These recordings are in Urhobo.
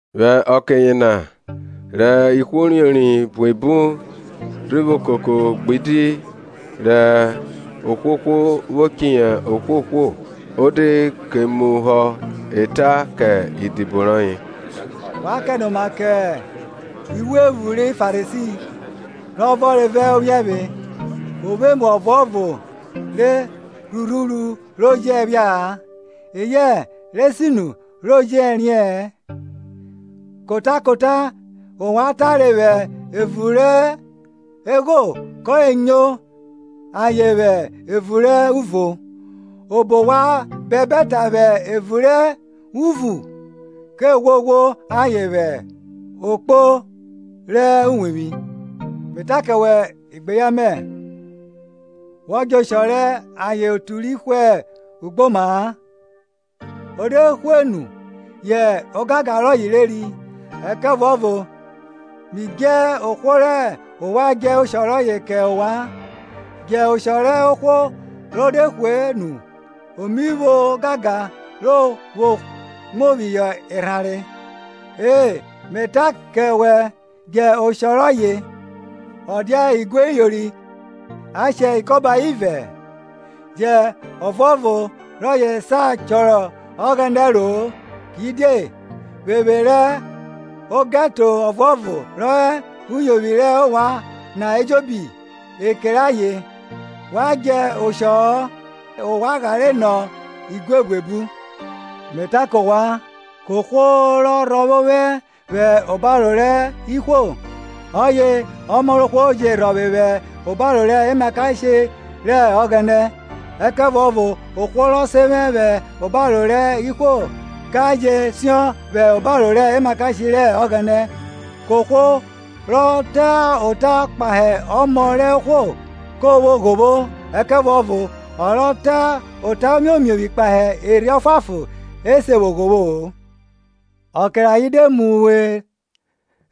Vwẹ ọke yena, rẹ ihwo uriori buebu rhi vwo koko gbidi rẹ ohwohwo vwo chiyi ohwohwo, o de ke muhọ ẹta kẹ idibo rọye, Wa kẹnoma kẹ iphuephu ri Farisi, rọ vọnre vẹ ophiẹvwe. O vwo emu ọvuọvo re rhurhuru ro jẹ phia-a, eyẹ re sinu re jẹ riẹ-ẹn. Kota kota rẹ ovwan tare vwẹ evun rẹ egho ke nyo ayen vwẹ evun rẹ uvo, obo wa bẹbẹ ta vwẹ evun rẹ uvun ke ghwoghwo ayen vwẹ okpo rẹ uwevwi. Me ta kẹ wẹ, igbeyan mẹ, wọ djẹ oshọ rẹ ayen otu ri hwe ugboma-a, o de hwe nu yẹ ogangan rọye reri. Ẹkẹvuọvo mi dje ohwo rẹ ovwan djẹ oshọ rọye kẹ ovwan; Djẹ oshọ rẹ ohwo ro de hwe nu o mi vwo ogangan ro vwo mu phihọ erhanre; e, Me ta kẹ wẹ, djẹ oshọ rọye! Ọ dia igue iyori a shẹ ikọba ivẹ-ẹ? Jẹ ọvuọvo rọye sa chọrọ Ọghẹnẹ ẹro-o. Kidie, vwevwe rẹ ogẹto ọvuọvo rọ hẹ uyovwi rẹ ovwan na ejobi ekere ayen. Wa djẹ oshọ-ọ, ovwan ghare nọ igue buebu. Me ta kẹ ovwan, kohwo rọ rhọvwe ovwẹ vwẹ obaro rẹ ihwo, ọye Ọmọ rẹ ohwo je rhọvwe vwẹ obaro rẹ emakashe rẹ Ọghẹnẹ. Ẹkẹvuọvo ohwo rọ sen vwẹ vwẹ obaro rẹ ihwo ka je siọn vwẹ obaro rẹ emakashe rẹ Ọghẹnẹ. Kohwo rọ ta ota kpahe Ọmọ rẹ ohwo ke vwọ ghovwo; ẹkẹvuọvo ọ rọ ta ota omiomiovwi kpahe Erhi Ọfuanfon e se vwo ghovwo-o. Ọke rẹ ayen de mu we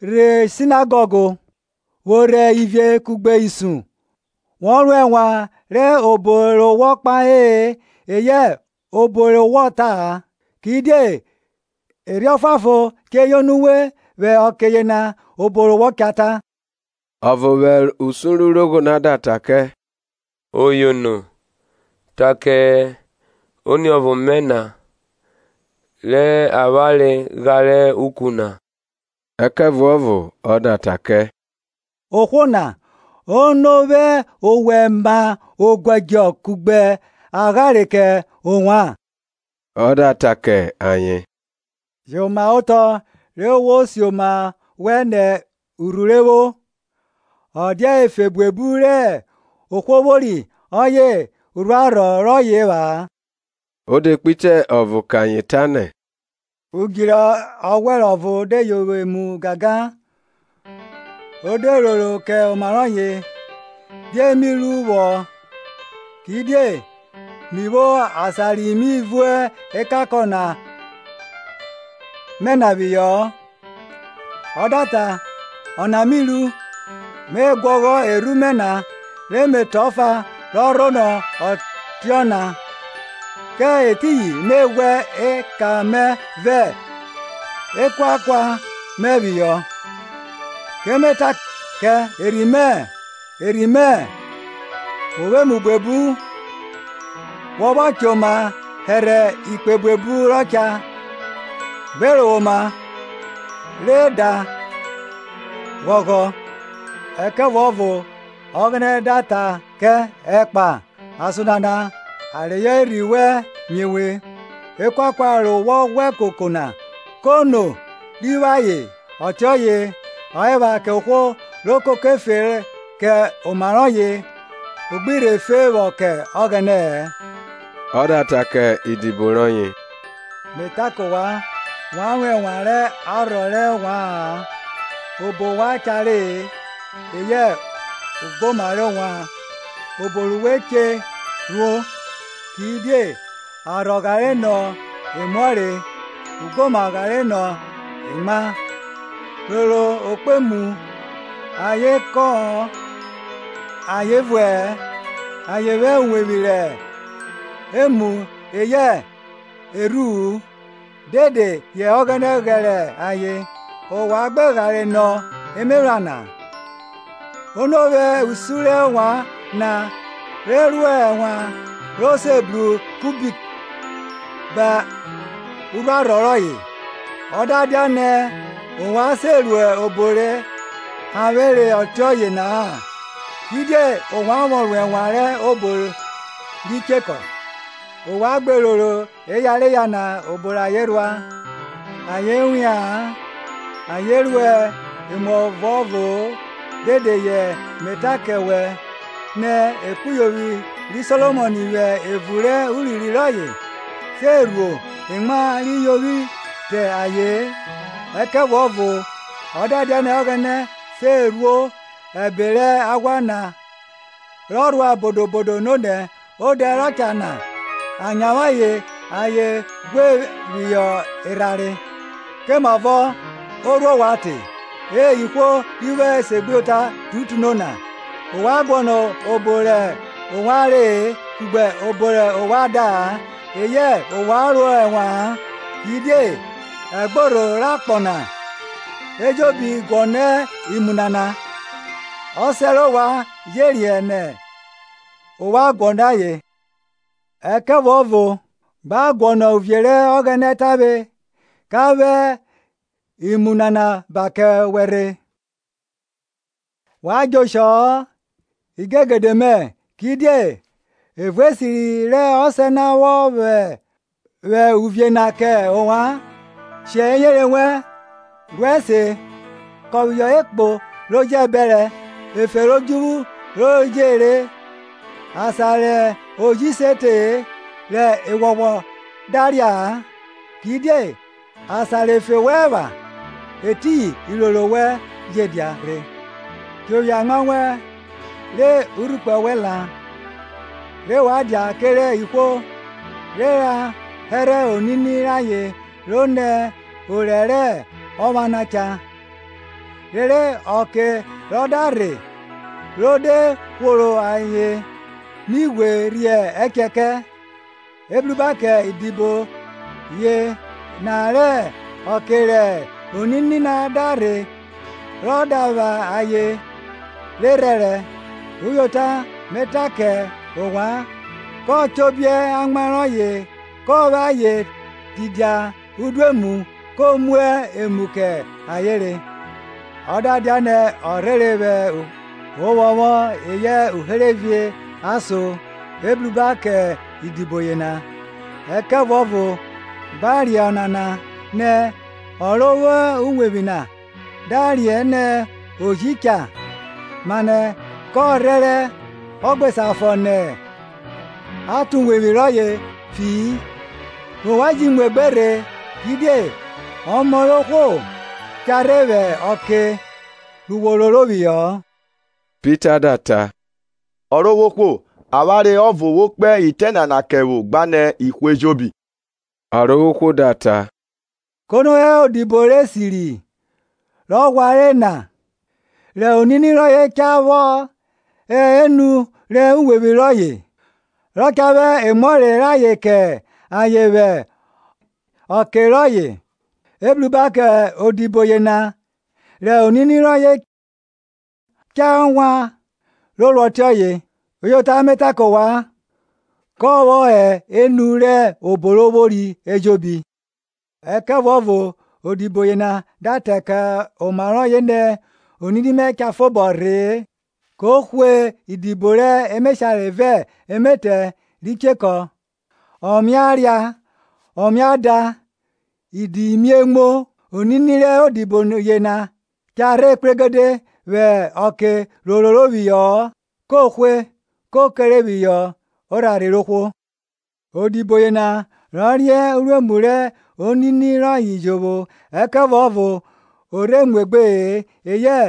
rhe Sinagọg, vwo rhe ivie kugbe isun, wo ro ẹnwan rẹ obo re wọ kpahe-e eyẹ obo re wọ ta-a; Kidie Erhi Ọfuanfon che yono uwe vwẹ ọke yena obo ru wọ cha ta. Ọvo vwẹ usun rẹ urogho na da ta kẹ, Oyono, ta kẹ oniọvo mẹ na re avwanre ghare uku na. Ẹkẹvuọvo ọ da ta kẹ, Ohwo na, ono vwẹ ovwẹ ma oguẹdjọ kugbe aghare kẹ ovwan? Ọ da ta kẹ ayen, Jomaotọ, re wo si oma wẹn nẹ urhuru evwo; ọ dia efe buebu rẹ ohwo vwori ọye urhuarhọ rọye epha-a. O de kpe itẹ ọvo kẹ ayen tanẹ, udju rẹ ọghwẹrẹ ọvo de yovwi emu gangan; O de roro kẹ oma rọye, Die mi ru vwọ, kidie mi vwo asan ri mi vun ekankọn mẹ na phihọ-ọ? Ọ da ta, Ọna mi ru. Me guọghọ erhu mẹ na, re me tọn ọfa rọ rhonọ ọtiọna; kẹ etiyin me ghwẹ eka mẹ vẹ ekuakau mẹ phihọ. Ke me ta kẹ erhi mẹ, Erhi mẹ, wo vwo emu buebu wọ vwọ choma hẹrhẹ ikpe buebu rọ cha; gbe rovwoma, re, da, ghọghọ. Ẹkẹvuọvo Ọghẹnẹ da ta ke, Ekpa! Ason nana a reyọ erhi wẹn mie we; ekuakua re wọ ghwẹ koko na, kono ri vwo ayen? Ọtiọye ọ epha kẹ ohwo ro koko efe kẹ oma rọye, o gbi rhe fe vwọ kẹ Ọghẹnẹ-ẹ. Ọ da ta kẹ idibo rọye, Me ta kẹ ovwan, wa ro ẹnwan rẹ arhọ rẹ ovwa-an, obo wa cha re, eyẹ ugboma rẹ ovwan, obo ru we che rhuo. Kidie arhọ ghare nọ emuọre, ugboma ghare nọ emwa. Roro okpemu; ayen kọ-ọn ayen vuẹ-ẹ, ayen vwo uwevwi rẹ emu-u eyẹ erhu-u, dede yẹ Ọghẹnẹ ghẹrẹ ayen. Ovwan gbe ghare nọ emephran na! Ono vwe usun rẹ ovwan na re ro ẹnwan ro se bru kubit ba urhuarhọ rọye? Ọ da dianẹ ovwan se ru obo re hanvwere ọtiọye na-a, kidie ovwan vwọ ro ẹnwan rẹ obo ri chekọ? Ovwan gbe roro eyareya na, obo rẹ ayen rhua; ayen wia-an ayen ruẹ emuọvo-o; dede ye me ta kẹ wẹ, nẹ ekpuyovwi ri Solomọn vwẹ evun rẹ urinrin rọye se rhuo emwa ri yovwi te aye-en. Ẹkẹvuọvo ọ da dianẹ Ọghẹnẹ se rhuo ẹbe rẹ aghwa na rọ rhua bodo bodo nonẹ odẹ rọ cha na a nyavwe ayen ghwẹ phihọ erhanre, komavọ o rhuo ovwan te, E ihwo ri vwo esegbuyota tutuno na? Ovwan guọnọ obo rẹ ovwan re-e kugbe obo rẹ ovwan da-a, eyẹ ovwan ro ẹnwa-an. Kidie ẹgborho rẹ akpọ na ejobi guọnọ imu nana; Ọsẹ rẹ ovwan je riẹn nẹ ovwan guọnọ ayen. Ẹkẹvuọvo, gba ka guọnọ uvie rẹ Ọghẹnẹ tavwe, ka vwẹ imu nana ba kẹ wẹ rhe. Wa djẹ oshọ-ọ, imigegede mẹ, kidie evun esiri rẹ Ọsẹ na rọ vwọ vwẹ uvie na kẹ ovwan. Shẹ eyere wẹn, ru ẹse, kọn phihọ ekpo ro jẹ bẹrẹ, efe rẹ odjuvwu ro je re, asan rẹ oji se te-e rẹ eghwọghwọ da ria-a. Kidie asan rẹ efe wẹn epha, etiyin iroro wẹn je dia rhe. Chobiẹ amwa wẹn re urhukpẹ wẹn la, re wa dia kerẹ ihwo re ra hẹrhẹ onini rayen ro nẹ orẹ rẹ ọpha na cha, rere ọke rọ da rhe ro de hworo ayen mi ghwe rhie ẹchẹ kẹ. Ebruba kẹ idibo yena rẹ ọke rẹ onini na da rhe rọ da vwa ayen re rhẹrẹ; uyota, me ta kẹ ovwan, kọ chobiẹ amwa rọye kọ vwẹ ayen tidia udoemu, ko mu emu kẹ ayen re. Ọ da dianẹ ọ rhere vwẹ ovwọnvwọn eyẹ uherevie ason, ebruba kẹ idibo yena. Ẹkẹvuọvo gba riẹn ọnana, nẹ ọ ro vwo uwevwi na da riẹn nẹ oji cha, mane ka rhẹrẹ a gbe sa fọ nẹ a tọn uwevwi rọye fi-i. Ovwan ji muegbe rhe; kidie ọmọ rẹ ohwo cha rhe vwẹ ọke wo roro phihọ-ọ. Pita da ta, Ọrovwohwo, avwanre ọvo wo kpe itẹ nana kẹ vwo gbenẹ ihwo ejobi? Ọrovwohwo da ta, Kono hẹ odido rẹ esiri rọ ghwanre na, rẹ onini rọye cha vwọ hẹ enu rẹ uwevwi rọye, rọ cha vwẹ emuọre rayen kẹ ayen vwẹ ọke rọye? Ebruba kẹ odibo yena rẹ onini rọye cha vwa ro ruẹ ọtiọye. Uyota me ta kẹ ovwan, kọ vwọ hẹ enu rẹ obo ro vwori ejobi. Ẹkẹvuọvo odibo yena da ta kẹ oma rọye nẹ, Onini mẹ cha fobọ rhee, ko hwe idibo rẹ emeshare vẹ emetẹ ri chekọ, ọ mia ria ọ mia da idi mie muo, onini rẹ odibo yena cha rhe kpregede vwẹ ọke ro roro phihọ-ọ, ko hwẹ, ko kere phihọ orharhe rẹ ohwo. Odibo yena rọ riẹn uruemu rẹ onini rọye jovwo, ẹkẹvuọvo o rhe muegbe-e eyẹ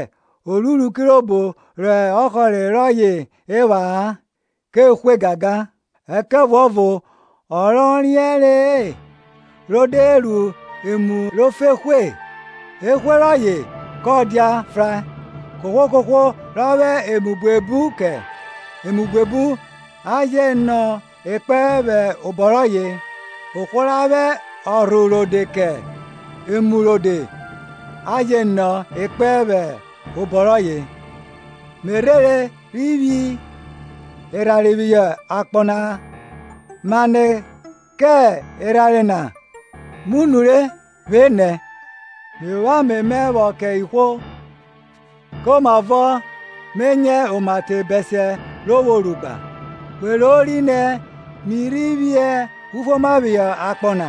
o ruru kirobo rẹ ọhọre rọye epha-a, ke hwe gangan. Ẹkẹvuọvo ọ rọ riẹnre-e, ro de ru emu ro fo ehwe, ehwe rọye kọ dia frae. Kohwo kohwo ra vwẹ emu buebu ke, emu buebu a je nọ ekpẹn vwẹ obọ rọye; ohwo ra vwẹ ọrho rode kẹ emu rode a je nọ ekpẹn vwẹ obọ rọye. Me rhere rhi phi erhanre phihọ akpọ na; mane kẹ erhanre na mu nure vwenẹ! Mi vwo ame mẹ vwọ kẹ ihwo; komavọ me nyẹ oma te bẹsiẹ ro vwo ru gba! We rori nẹ mi rhi phi ufuoma phihọ akpọ na?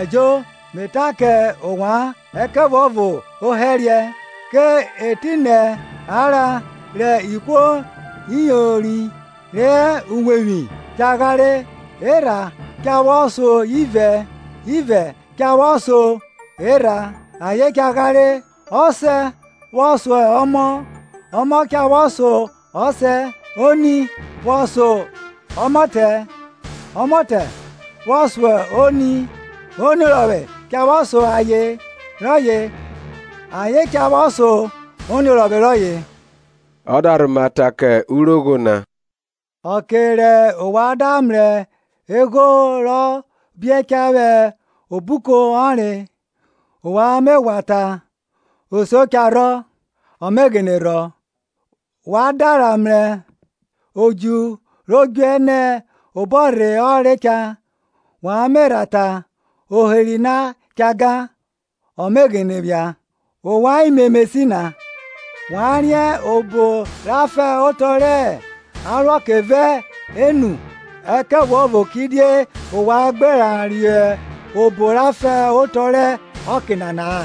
Ẹjo, Me ta kẹ ovwan, ẹkẹvuọvo ohẹriẹ. Ke etinẹ a ra re ihwo iyori re hẹ uwevwi cha ghare, erha cha vwọ so ivẹ ivẹ cha vwọ so erha; ayen cha ghare, ọsẹ vwọ so ọmọ ọmọ cha vwo so ọsẹ, oni vwọ so ọmọtẹ ọmọtẹ vwọ so oni, oniorọvwe cha vwọ so aye rọye aye cha vwọ so oniorọvwe rọye. Ọ da rhoma ta kẹ urogho na, Ọke rẹ ovwan da mrẹ egho rọ biẹ cha vwẹ obuko ọnre, ovwan me ghwa ta, Osio cha rhọ; ọ me ghene rhọ. Wa da rha mrẹ odju ro djuẹ nẹ obọrhe ọnre cha, wa me rha ta, oheri na cha gan; ọ me ghene phia. Ovwan imemesi na! Wa riẹn obo ra fan otọ rẹ aruọke vẹ enu; ẹkẹvuọvo kidie ovwan gbe riẹn obo ra fan otọ rẹ ọke nana-a?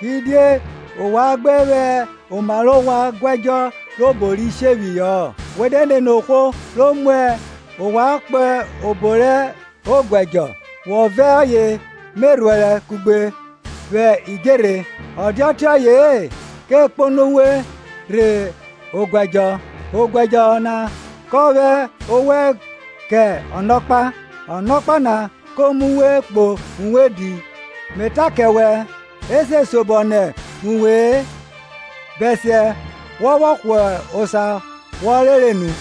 Kidie ovwan gbe vwẹ oma rẹ ovwan guẹdjọ rẹ obo ri shephihọ-ọ? We de nene ohwo ro mu ovwan kpo obo rẹ oguẹdjọ, wọ vẹ ọye me rhuẹrẹ kugbe vwẹ idjerhe, o dia ọtiọye-e ko kpono uwe rhe oguẹdjọ, oguẹdjọ na kọ vwẹ owẹ kẹ ọnọkpa, ọnọkpa na ko mu we kpo uwodi. Me ta kẹ wẹ, e se siobọ nẹ uwe-e bẹsiẹ wọ vwọ hwa osa wọ rere nu.